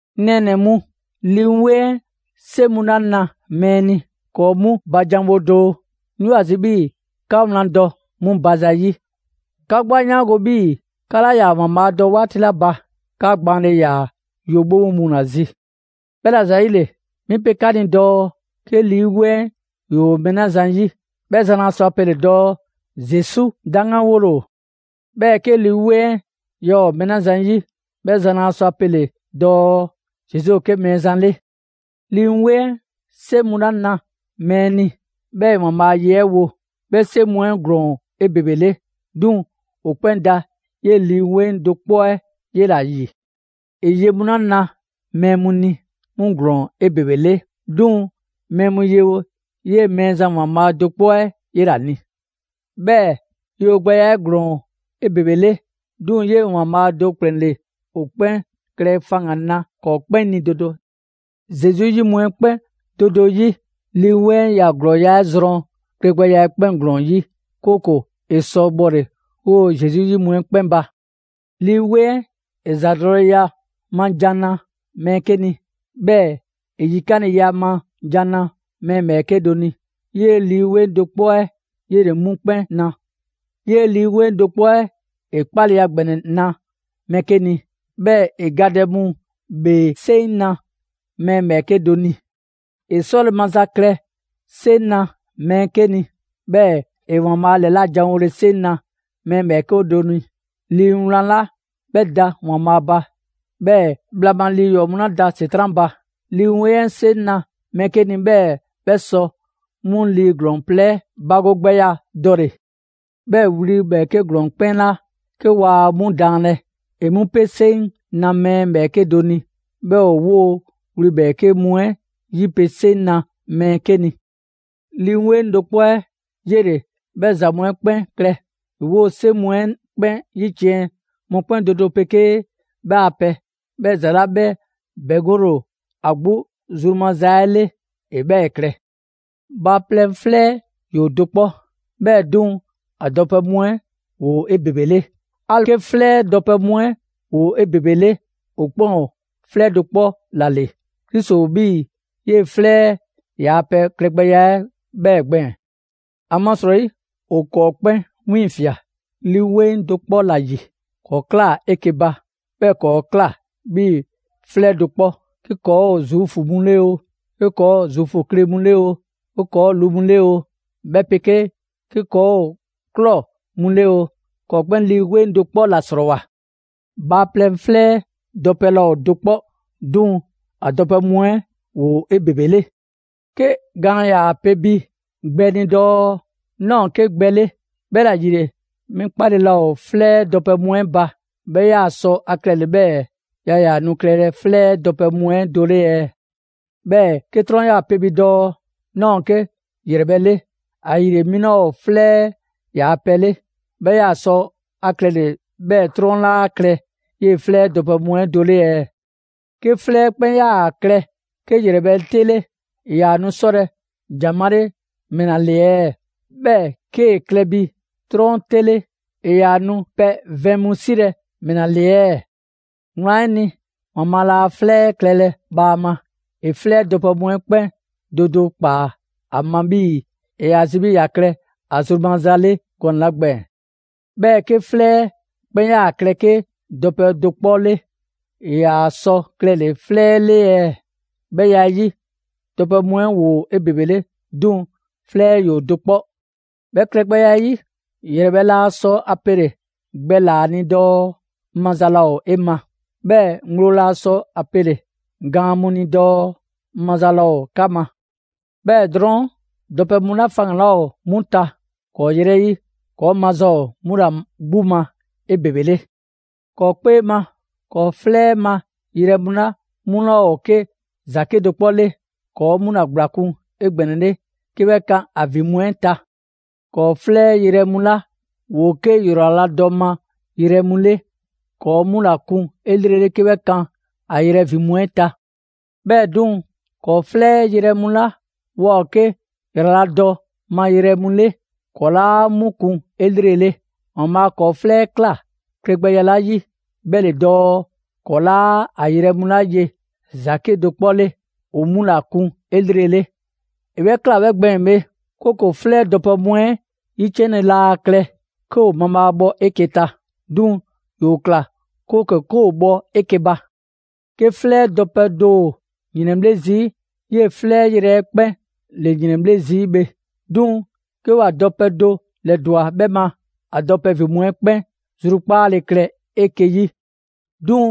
'Ŋ nɛɛnɛ‑ mu, Lii 'Weŋ 'ɛ 'seŋ mu 'la na mɛɛ ni, ‑kɔɔ' 'mu ba janwo doo. 'Ŋ 'yoo ‑a zi 'bhii‑ 'ka wlan dɔ 'mu ba zayi'. 'Ka 'gbu 'a 'yaango‑ 'bhii‑ 'ka 'laa ‑yaa ‑Waanbhaa' dɔ 'waati 'la ba, 'ka gbaanle ‑yaa yo 'bhobho mu ‑la zi. 'Bhɛla‑ ‑zayile, 'mi pe 'ka ni dɔɔ 'ke 'Lii 'Weŋ 'ɛ ‑yoo mɛɛ 'la zan ‑yi, 'bhɛ zan laa sɔ ‑a pele dɔɔ: «Zesu 'daŋganwole ‑o!» 'Bhɛɛ‑ 'ke Lii 'Weŋ 'ɛ yaa ‑o mɛɛ 'la zan ‑yi, 'bhɛ zan laa sɔ ‑a pele‑ dɔɔ: «Zesu ‑o 'ke Mɛɛzan 'le!» Lii 'Weŋ 'ɛ 'seŋ mu 'la na mɛɛ ni, 'bhɛɛ‑ ‑e ‑Waanbhaa' a ye 'ɛ wo, 'bhɛ 'seŋ mu 'ɛ ‑glɔɔn ‑o 'ebebele; 'duŋ‑ ‑o 'kpɛn da 'yee‑ Lii 'Weŋ do 'kpɔ 'ɛ 'yela‑ ‑yi. ‑E ye mu 'la na mɛɛ mu ni, 'mu ‑glɔɔn ‑o 'ebebele, 'duŋ‑ mɛɛ mu yewo 'yee‑ Mɛɛzan ‑Waanbhaa' do 'kpɔ 'ɛ 'yela‑ ni. 'Bhɛɛ‑ yewogbɛya 'ɛ ‑glɔɔn ‑o 'ebebele, 'duŋ‑ 'yee‑ ‑Waanbhaa' do ‑kplɛn ‑le ‑o 'kpɛn klɛ faŋgan‑ na ‑kɔɔ' 'kpɛn ni do do. Zesu 'yi mu 'ɛ 'kpɛn do do 'yi, Lii 'Weŋ 'ɛ ‑ya ‑glɔɔya' 'ɛ zrɔn klɛgbɛya 'ɛ 'kpɛn ‑glɔɔn 'yi, 'kooko‑ ‑e sɔ bhɔle‑ 'woo‑ Zesu 'yi mu 'ɛ 'kpɛn ba. Lii 'Weŋ 'ɛ ‑e ‑zadɔleya ma ‑jan na mɛɛ 'ke ni, 'bhɛɛ‑ ‑e yikanleya ma ‑jan na mɛɛ ‑bhɛɛke' do ni. 'Yee Lii 'Weŋ do 'kpɔ 'ɛ 'yele‑ 'mu 'kpɛn na. 'Yee‑ Lii 'Weŋ do 'kpɔ 'ɛ ‑e 'kpaleya ‑gbɛnɛ na mɛɛ 'ke ni; 'bhɛɛ‑ ‑e gadɛ mu ‑bhee 'seŋ na mɛɛ ‑bhɛɛke' do ni. ‑E 'sɔle‑ maza klɛ 'seŋ na mɛɛ 'ke ni; 'bhɛɛ‑ ‑e ‑Waanbhaa' ‑lɛlajanwole 'seŋ na mɛɛ ‑bhɛɛke' do ni; Lii Wlan 'la 'bhɛ da ‑Waanbhaa' ba, 'bhɛɛ‑ bhla ma lii ‑yɔɔ' mu 'la da ‑Setran' ba, Lii 'Weŋ 'ɛ 'seŋ na mɛɛ 'ke ni 'bhɛɛ‑ 'bhɛ sɔ 'mu lii ‑glɔɔn plɛ 'ɛ bagogbɛya dɔle‑; 'bhɛɛ‑ wli ‑bhɛɛke' ‑glɔɔn 'ɛ 'kpɛn 'la 'ke waa 'mu daanlɛ, ‑e 'mu 'pe 'seŋ na mɛɛ ‑bhɛɛke' do ni; 'bhɛɛ‑ ‑e 'woo‑ wli ‑bhɛɛke' mu 'ɛ 'yipele 'seŋ na mɛɛ 'ke ni. Lii 'Weŋ do 'kpɔ 'ɛ 'yele‑ 'bhɛ ‑za mu 'ɛ 'kpɛn klɛ; ‑e 'woo‑ 'seŋ mu 'ɛ 'kpɛn 'yiciɛn‑ mɔkpɛn' ma do do; mɔkpɛn' do do 'pegee 'bhɛ a pɛ, 'bhɛɛ‑ ‑za 'la 'bhɛ ‑bɛŋgole ‑o ‑a 'gbu zru maza 'ɛ 'le, ‑e 'bhɛɛ‑ klɛ. Bhaaplɛŋ 'flɛ 'ɛ ‑yoo do 'kpɔ, 'bhɛɛ‑ 'duŋ‑ a dɔpɛ mu 'ɛ ‑woo 'ebebele. 'Ali‑ 'ke 'flɛ 'ɛ dɔpɛ mu 'ɛ ‑woo 'ebebele, ‑o 'kpɛn ‑o 'flɛ do 'kpɔ ‑la ‑le. Krisi ‑o 'bhii‑ 'yee‑ 'flɛ 'ɛ ‑yaa' pɛ klɛgbɛya 'ɛ 'bhɛɛ‑ gbɛɛn‑. ‑Amasrɔyi, ‑o ‑kɔɔ' 'kpɛn 'wiiŋfia꞊ Lii 'Weŋ do 'kpɔ ‑la ‑yi. ‑Kɔɔ ꞊klaa 'eke‑ ba, 'bhɛɛ‑ ‑kɔɔ' ꞊kla 'bhii‑ 'flɛ do 'kpɔ. 'Ke ‑kɔɔ' ‑o Zuufu mu 'le oo, 'ke ‑kɔɔ' ‑o Zuufu kle mu 'le oo, 'ke ‑kɔɔ' ‑o lu mu 'le oo, 'bhɛ 'pegee 'ke ‑kɔɔ' ‑o ꞊klɔ mu 'le oo, ‑kɔɔ' 'kpɛn Lii 'Weŋ do 'kpɔ ‑la 'srɔɔwoa‑. Bhaaplɛŋ 'flɛ 'ɛ dɔpɛ laa ‑o do 'kpɔ, 'duŋ‑ ‑a dɔpɛ mu 'ɛ ‑woo 'ebebele. 'Ke gaan ‑yaa pe bi gbɛ ni dɔɔ: «'Naa ‑o 'ke gbɛ 'le, 'bhɛla‑ ‑yile 'mi 'kpale‑ laa ‑o 'flɛ 'ɛ dɔpɛ mu 'ɛ ba». 'Bhɛ 'yaa‑ sɔ ‑a klɛle‑ 'bhɛɛ‑ yaa ‑yaa nu klɛlɛ 'flɛ 'ɛ dɔpɛ mu 'ɛ do 'le ɛɛ? 'Bhɛɛ‑ 'ke 'trɔn 'yaa‑ pe bi dɔɔ: «'Naa ‑o 'ke ‑yrɛbhɛ' 'le, ‑ayile 'mi 'laa ‑o 'flɛ 'ɛ ‑yaa' pɛ 'le». 'Bhɛ 'yaa‑ sɔ ‑a klɛle‑ 'bhɛɛ‑ 'trɔn 'laa klɛ 'yee‑ 'flɛ 'ɛ dɔpɛ mu 'ɛ do 'le ɛɛ? 'Ke 'flɛ 'ɛ 'kpɛn 'yaa‑ klɛ 'ke ‑yrɛbhɛ' 'te 'le, ‑e ‑yaa nu 'sɔlɛ‑ ‑jan 'male‑ ‑mɛla ‑le ɛɛ? 'Bhɛɛ‑ 'kee‑ klɛ bi 'trɔn 'te 'le, ‑e ‑yaa nu pɛ vɛn mu 'silɛ‑ ‑mɛla ‑le ɛɛ? Wlan 'ɛ ni, ‑Waanbhaa' laa 'flɛ 'ɛ klɛlɛ bhaama. ‑E 'flɛ 'ɛ dɔpɛ mu 'ɛ 'kpɛn do do ‑kpaa ‑a ma 'bhii‑ ‑e ‑yaa zi 'bhii‑ ‑ya klɛ ‑a zru maza 'le gɔnɛ‑ 'la gbɛɛn‑. 'Bhɛɛ‑ 'ke 'flɛ 'ɛ 'kpɛn 'yaa‑ klɛ 'ke dɔpɛ do 'kpɔ 'le, ‑e 'yaa‑ sɔ klɛle‑ 'flɛ 'le ɛɛ? 'Bhɛ ya 'ɛ 'yi, dɔpɛ mu 'ɛ ‑woo 'ebebele, 'duŋ‑ 'flɛ 'ɛ ‑yoo do 'kpɔ. 'Bhɛ klɛgbɛya 'ɛ 'yi, ‑yrɛbhɛ' laa sɔ ‑a pele‑ gbɛlaa‑ ni dɔɔ: «'Ŋ maza laa ‑o 'e ma!» 'Bhɛɛ‑ ŋgblo laa sɔ ‑a pele‑ gaan mu ni dɔɔ: «'Ŋ maza laa ‑o 'ka ma!» 'Bhɛɛ‑ drɔɔn', dɔpɛ mu 'la faŋgan‑ 'laa ‑o 'mu ta ‑kɔɔ' 'yrɛ 'yi, ‑kɔɔ' maza ‑o 'mu ‑la 'gbu ma 'ebebele. ‑Kɔɔ' 'kpee ma ‑kɔɔ' 'flɛ 'ɛ ma yrɛ mu 'la 'mu 'laa ‑o 'ke ‑za 'kedo‑ 'kpɔ 'le, ‑kɔɔ' 'mu ‑la ‑gblakun' 'egbɛnɛle 'ke 'bhɛ kan ‑a ‑vin mu 'ɛ ta. ‑Kɔɔ' 'flɛ yrɛ mu 'la ‑woo 'ke ‑yraladɔ ma yrɛ mu 'le, ‑kɔɔ' 'mu ‑la kun 'elrele 'ke 'bhɛ kan ‑a yrɛ ‑vin mu 'ɛ ta. 'Bhɛɛ‑ 'duŋ‑, ‑kɔɔ' 'flɛ 'ɛ yrɛ mu 'la waa ‑o 'ke ‑yraladɔ ma yrɛ mu 'le, ‑kɔɔ 'laa 'mu kun 'elrele. ‑Waanbhaa' ‑kɔɔ' 'flɛ 'ɛ ꞊kla klɛgbɛya 'la 'yi, 'bhɛ ‑le dɔɔ, ‑kɔɔ' 'laa a yrɛ mu 'la ye ‑za 'kedo‑ 'kpɔ 'le, ‑o 'mu ‑la kun 'elrele. ‑E 'bhɛ ꞊kla 'bhɛ gbɛɛn‑ bhe, 'kooko‑ 'flɛ dɔpɛ mu 'ɛ 'yiciɛnle laa klɛ 'ke ‑o mabhaabhɔ 'eke‑ ta; 'duŋ‑ ‑yoo ꞊kla 'kooko‑ 'ke ‑o bhɔ 'eke‑ ba. 'Ke 'flɛ 'ɛ dɔpɛ do ‑o ‑yrɛnbhle' zii', 'yee‑ 'flɛ yrɛ 'ɛ 'kpɛn ‑le ‑yrɛnbhle' zii' bhe. 'Duŋ‑ 'ke ‑wa dɔpɛ do ‑lɛdwa 'bhɛ ma, ‑a dɔpɛ ‑vin mu 'ɛ 'kpɛn zrukpaale klɛ 'eke‑ 'yi. 'Duŋ‑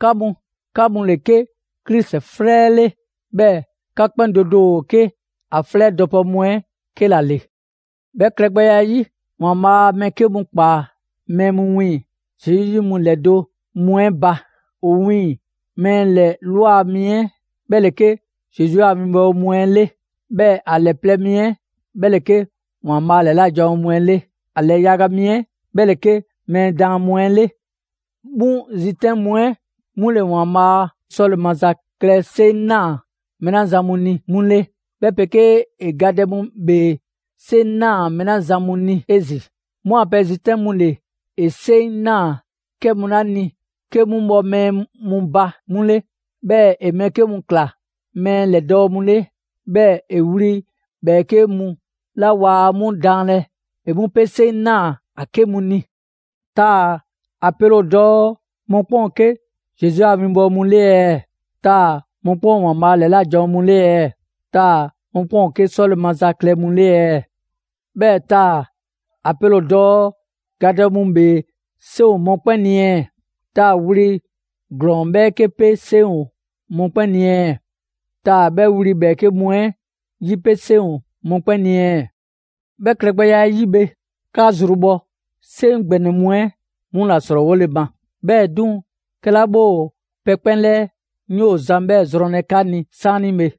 'ka mu, 'ka mu ‑le 'ke Krisi 'flɛ 'ɛ 'le. 'Bhɛɛ‑ 'ka 'kpɛn do do ‑o 'ke ‑a 'flɛ dɔpɛ mu 'ɛ 'ke ‑la ‑le. 'Bhɛ klɛgbɛya 'ɛ 'yi, ‑Waanbhaa' mɛɛ 'ke mu ꞊kpaa mɛɛ mu wiiŋ‑ Zesu 'yi mu ‑lɛdo' mu 'ɛ ba: ‑O wiiŋ‑ mɛɛ ‑lɛ ꞊lwa mi 'ɛ 'bhɛ ‑le 'ke Zesu a 'winbɔwo mu 'ɛ 'le; 'bhɛɛ‑ ‑a ‑lɛ plɛ mi 'ɛ 'bhɛ ‑le 'ke ‑Waanbhaa' ‑lɛla' janwo mu 'ɛ 'le; ‑a ‑lɛ yaga mi 'ɛ 'bhɛ ‑le 'ke mɛɛ daan mu 'ɛ 'le. 'Mu zitɛn' mu 'ɛ 'mu ‑le ‑Waanbhaa' 'sɔle‑ maza klɛ 'seŋ ꞊naa mɛɛ 'la zan mu ni 'mu 'le, 'bhɛ 'pegee ‑e gadɛ mu ‑bhee 'seŋ ꞊naa mɛɛ 'la zan mu ni 'ezin‑; 'mu a pɛ zitɛn' mu ‑le ‑e 'seŋ ꞊naa 'kɛ mu 'la ni 'ke 'mu bhɔ mɛɛ ba 'mu 'le. 'Bhɛɛ‑ ‑e mɛɛ 'ke mu ꞊kla mɛɛ ‑lɛdɔɔ' 'mu 'le. 'Bhɛɛ‑ wli ‑bhɛɛke' mu 'la waa 'mu daanlɛ ‑e 'mu 'pe 'seŋ ꞊naa ‑a 'ke mu ni. Taa‑ ‑a pele ‑o dɔɔ mɔkpɛn' ‑o 'ke Zesu a 'winbɔwo mu 'le ɛɛ? Taa‑ mɔkpɛn' ‑o ‑Waanbhaa' ‑lɛla' janwo mu 'le ɛɛ? Taa‑ mɔkpɛn' ‑o 'ke 'sɔle‑ maza klɛ mu 'le ɛɛ? 'Bhɛɛ‑ taa‑ ‑a pele ‑o dɔɔ gadɛ mu ‑bhee 'seŋ ‑o mɔkpɛn' 'ni ɛɛ? Taa‑ wli ‑glɔɔn ‑bhɛɛke' 'pe 'seŋ ‑o mɔkpɛn' ni ɛɛ? Taa‑ 'bhɛ wli ‑bhɛɛke' mu 'ɛ 'yipe 'seŋ ‑o mɔkpɛn' ni ɛɛ? 'Bhɛ klɛgbɛya 'ɛ 'yi bhe, 'ka zrubhɔ 'seŋ ‑gbɛnɛ mu 'ɛ 'mu ‑la ‑srɔɔwole ma. 'Bhɛɛ‑ 'duŋ‑, 'kɛla 'bhɛ ‑o pɛ 'kpɛn 'lɛɛ, 'ŋ 'yoo‑ zan 'bhɛ zrɔnlɛ 'ka ni 'saanibhe.